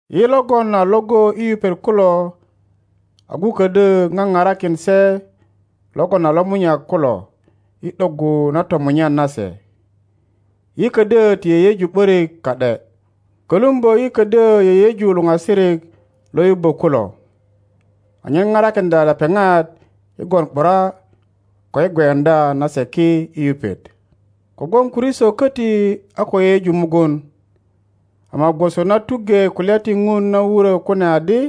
Yi logon a iŋgo i yupet kulo A agu ködyö ŋaparakin se logon a lomunyak kulo i ’doggu na tomunyan nase. Yi ködyö ti yeyeju ’börik ka ’de. Kölumbö yi ködyö yeyeju luŋasirik lo yubbö kulo, anyen parakiŋdya lepeŋat i gwon ’bura ko i gweuŋdya na se ki i yupet. Kogwon Kristo köti a ko yeyeju mugun, ama gwoso na tuŋge kulya ti Ŋun na wurö kune adi,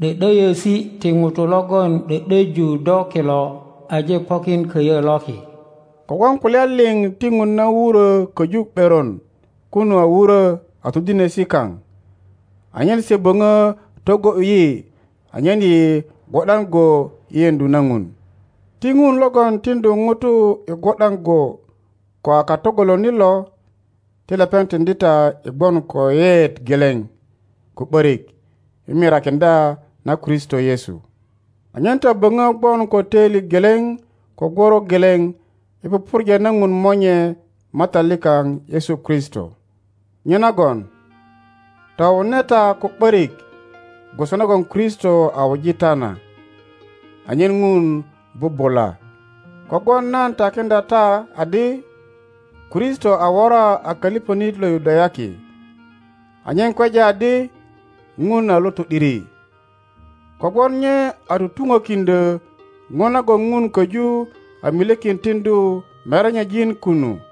’Dö’döyösi ti ŋutu logon ’dö ’döju do kilo aje pokin köyö loki. Kogwon kulya liŋ ti Ŋun na wurö köju ’beron kunu a wurö a todinesi kaŋ, anyen se böŋö togo ’yu yi anyen yi gwo ’dan go i yeŋdu na Ŋun. Ti Ŋun logon tiŋdu ŋutu i gwo ’dan go ko a katogolonit lo, ti lepeŋ tiŋdi ta i gwon ko yeyeet geleŋ ko ’börik i mirakiŋdya na Kristo Yesu, anyen ta böŋö gwon ko töili geleŋ ko gworo geleŋ i pupurja na Ŋun Monye Matat likaŋ Yesu Kristo. Nyenagon towune ta ko ’börik gwoso nagon Kristo a wuji ta na, anyen Ŋun bubula. Kogwon nan takiŋdya ta adi Kristo a wora a köliŋönit lo Yudayaki anyen kweja adi Ŋun a lo to ’diri, kogwon nye a tutuŋökiŋdyö ŋo nagon Ŋun köju a milyekin tiŋdu merenyejin kunu,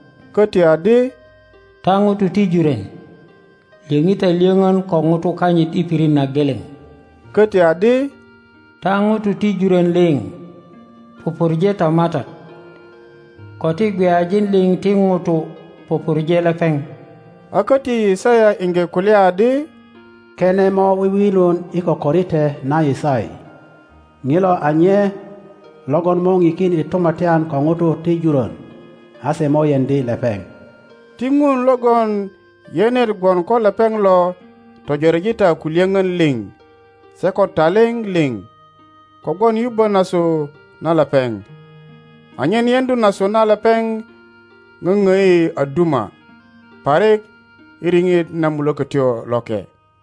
Köti adi, Ta ŋutu ti jurön, lyöŋi ta lyöŋön ko ŋutu kanyit i pirit na geleŋ. Köti adi, Ta ŋutu ti jurön liŋ, pupurje ta Matat, ko ti gweyajin liŋ ti ŋutu pupurje lepeŋ. A köti Yisaya iŋge kulya adi, Kene mo wiwilun i kokorite na Yisai, ŋilo a nye logon mo ŋikin i tumatyan ko ŋutu ti jurön;a se mo yeŋdi lepeŋ. Ti Ŋun logon yenet gwon ko lepeŋ lo töjoreji ta ko lyöŋön liŋ se ko taliŋ liŋ kogwon yubbö nasu na lepeŋ, anyen yeŋdu nasu na lepeŋ ŋöŋdi a duma parik i riŋit na Mulökötyo Loke.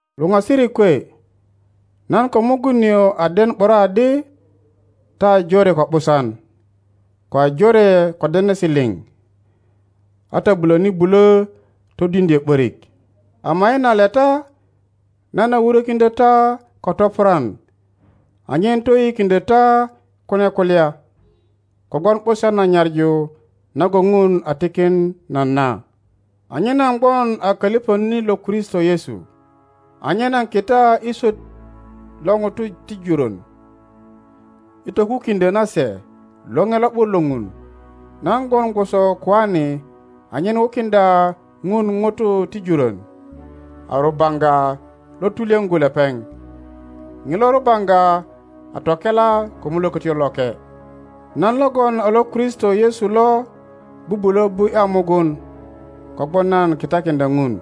Luŋasirik kwe, nan ko mugun nio a den ’bura adi ta a jore ko ’busan, ko a jore ko denesi liŋ, a ta bulöni bulö todiŋdyö ’börik. Ama i na leta nan a wurökiŋdyö ta ko topurwan anyen toyiyikiŋdyö ta kune kulya, kogwon ’busan na nyaŋu nagon Ŋun a tikin nan na, anyen nan gwon a köliŋönit lo Kristo Yesu, anyen nan kita i swöt lo ŋutu ti jurön i tokukiŋdyö na se Loŋe Lo ’but lo Ŋun. Nan gwon gwoso koane anyen wukiŋdya Ŋun ŋutu ti jurön a rubaŋga lo tulyöŋgu lepeŋ, ŋilo rubaŋga a tokela ko Mulökötyo Loke. Nan logon a lo Kristo Yesu lo bubulö bu ’ya mugun kogwon nan kitakiŋdya Ŋun.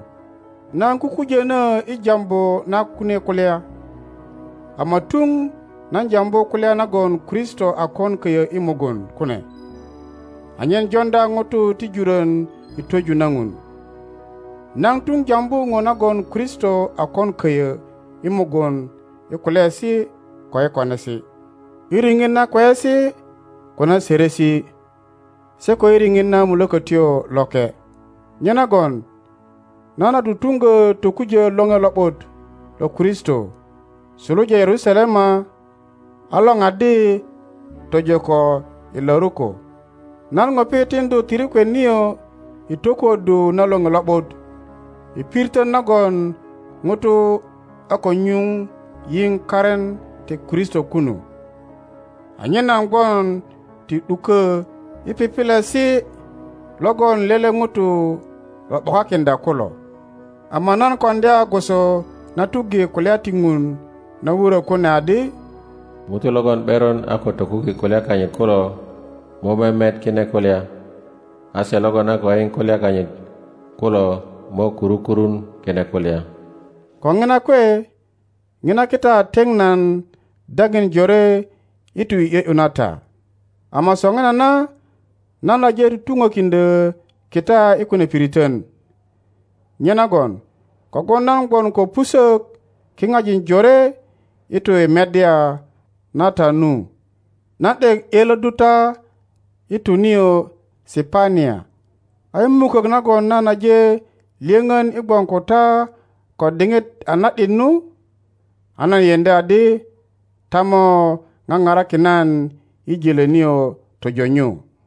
Nan kukujönö i jambu na kunie kulya, ama tuŋ nan jambu kulya nagon Kristo a kon köyö i mugun kune, anyen joŋdya ŋutu ti jurön i twöju na Ŋun. Nan tuŋ jambu ŋo nagon Kristo a kon köyö i mugun i kulyaesi ko i konesi, i riŋit na kweyesi ko na sörösi, se ko i riŋit na Mulökötyo Loke. Nyenagon nan a tutuŋgö tokujö Loŋe Lo ’but lo Kristo suluja Yerusalema a loraddi tojo ko Iluriko. Nan ŋupi tiŋdu tirikwet nio i tokuö ddu na Loŋe Lo ’but i piritön nagon ŋutu a ko nyuŋ yiŋ karin ti Kristo kunu, anyen nan gwon ti ’dukö i pipilesi logon lele ŋuto lo ’bokakiŋdya kulo. Ama nan koŋdya gwoso na tuŋge kulya ti Ŋun na wurö kune adi, Ŋutu logon ’beron a ko tokuki kulya kanyit kulo mo memet kine kulya, a se logon a ko yiŋ kulya kanyit kulo mo kuru kurun kine kulya. Ko ŋina kwe, ŋina kita a teŋ nan daŋin jore i tu i ’yö ’yu na ta. Ama soŋinana nan aje tutuŋökiŋdyö kita i kune piritön, nyenagon kogwon nan gwon ko pusök kiŋajin jore i tu i meddya na ta nu, nan ’dek ’yölöddu ta i tu nio Sipania. A i mukök nagon nan aje lyöŋön i gwon ko ta ko diŋit a na ’dit nu, a nan yeŋdi adi ta mo ŋaparakin nan i jölö nio tojo nyu.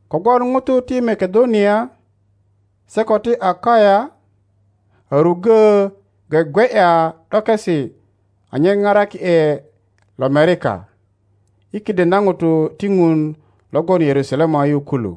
Kogwon ŋutu ti Makedonia se ko ti Akaya a ruggö gwegwe ’ya ’dokesi anyen paraki ’e lomerika i kiden na ŋutu ti Ŋun lo gwon Yerusalema yu kulu.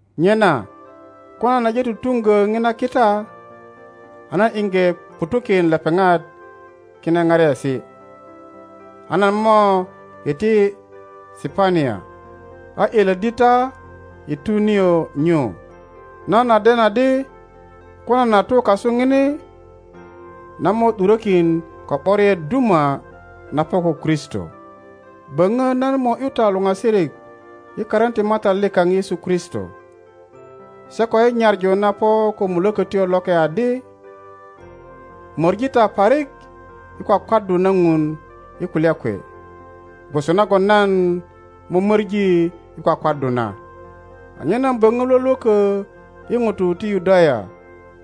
Nyena ko nan aje tutuŋgö ŋina kita, a nan iŋge ŋutu kin lepeŋat kine pariesi, a nan mo iti Sipania, a ’yölöddi ta i tu nio nyu. Nan a den adi ko nan a tu kasu ŋini, nan mo ’durökin ko ’boriet duma na po ko Kristo. Böŋö nan mo ’yu ta luŋasirik i karin ti Matat likaŋ Yesu Kristo, se ko i nyaŋu na po ko Mulökötyo Loke adi, Möŋi ta parik i kwakwaddu na Ŋun i kulya kwe, gwoso nagon nan mömöŋi i kwakwaddu na, anyen nan böŋö lwölwökö i ŋutu ti Yudaya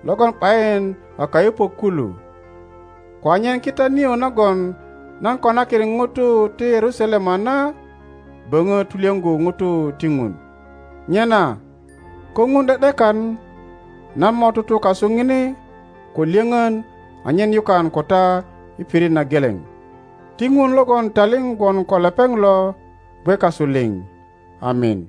logon ’bayin a kayupök kulu, ko anyen kita nio nagon nan konakin ŋutu ti Yerusalema na böŋö tulyöŋgu ŋutu ti Ŋun. Nyena ko Ŋun ’de ’dekan, nan mo tutu kasu ŋini ko lyöŋön anyen yukan ko ta i pirit na geleŋ. Ti Ŋun logon taliŋ gwon ko lepeŋ lo gwe kasu liŋ. Amin.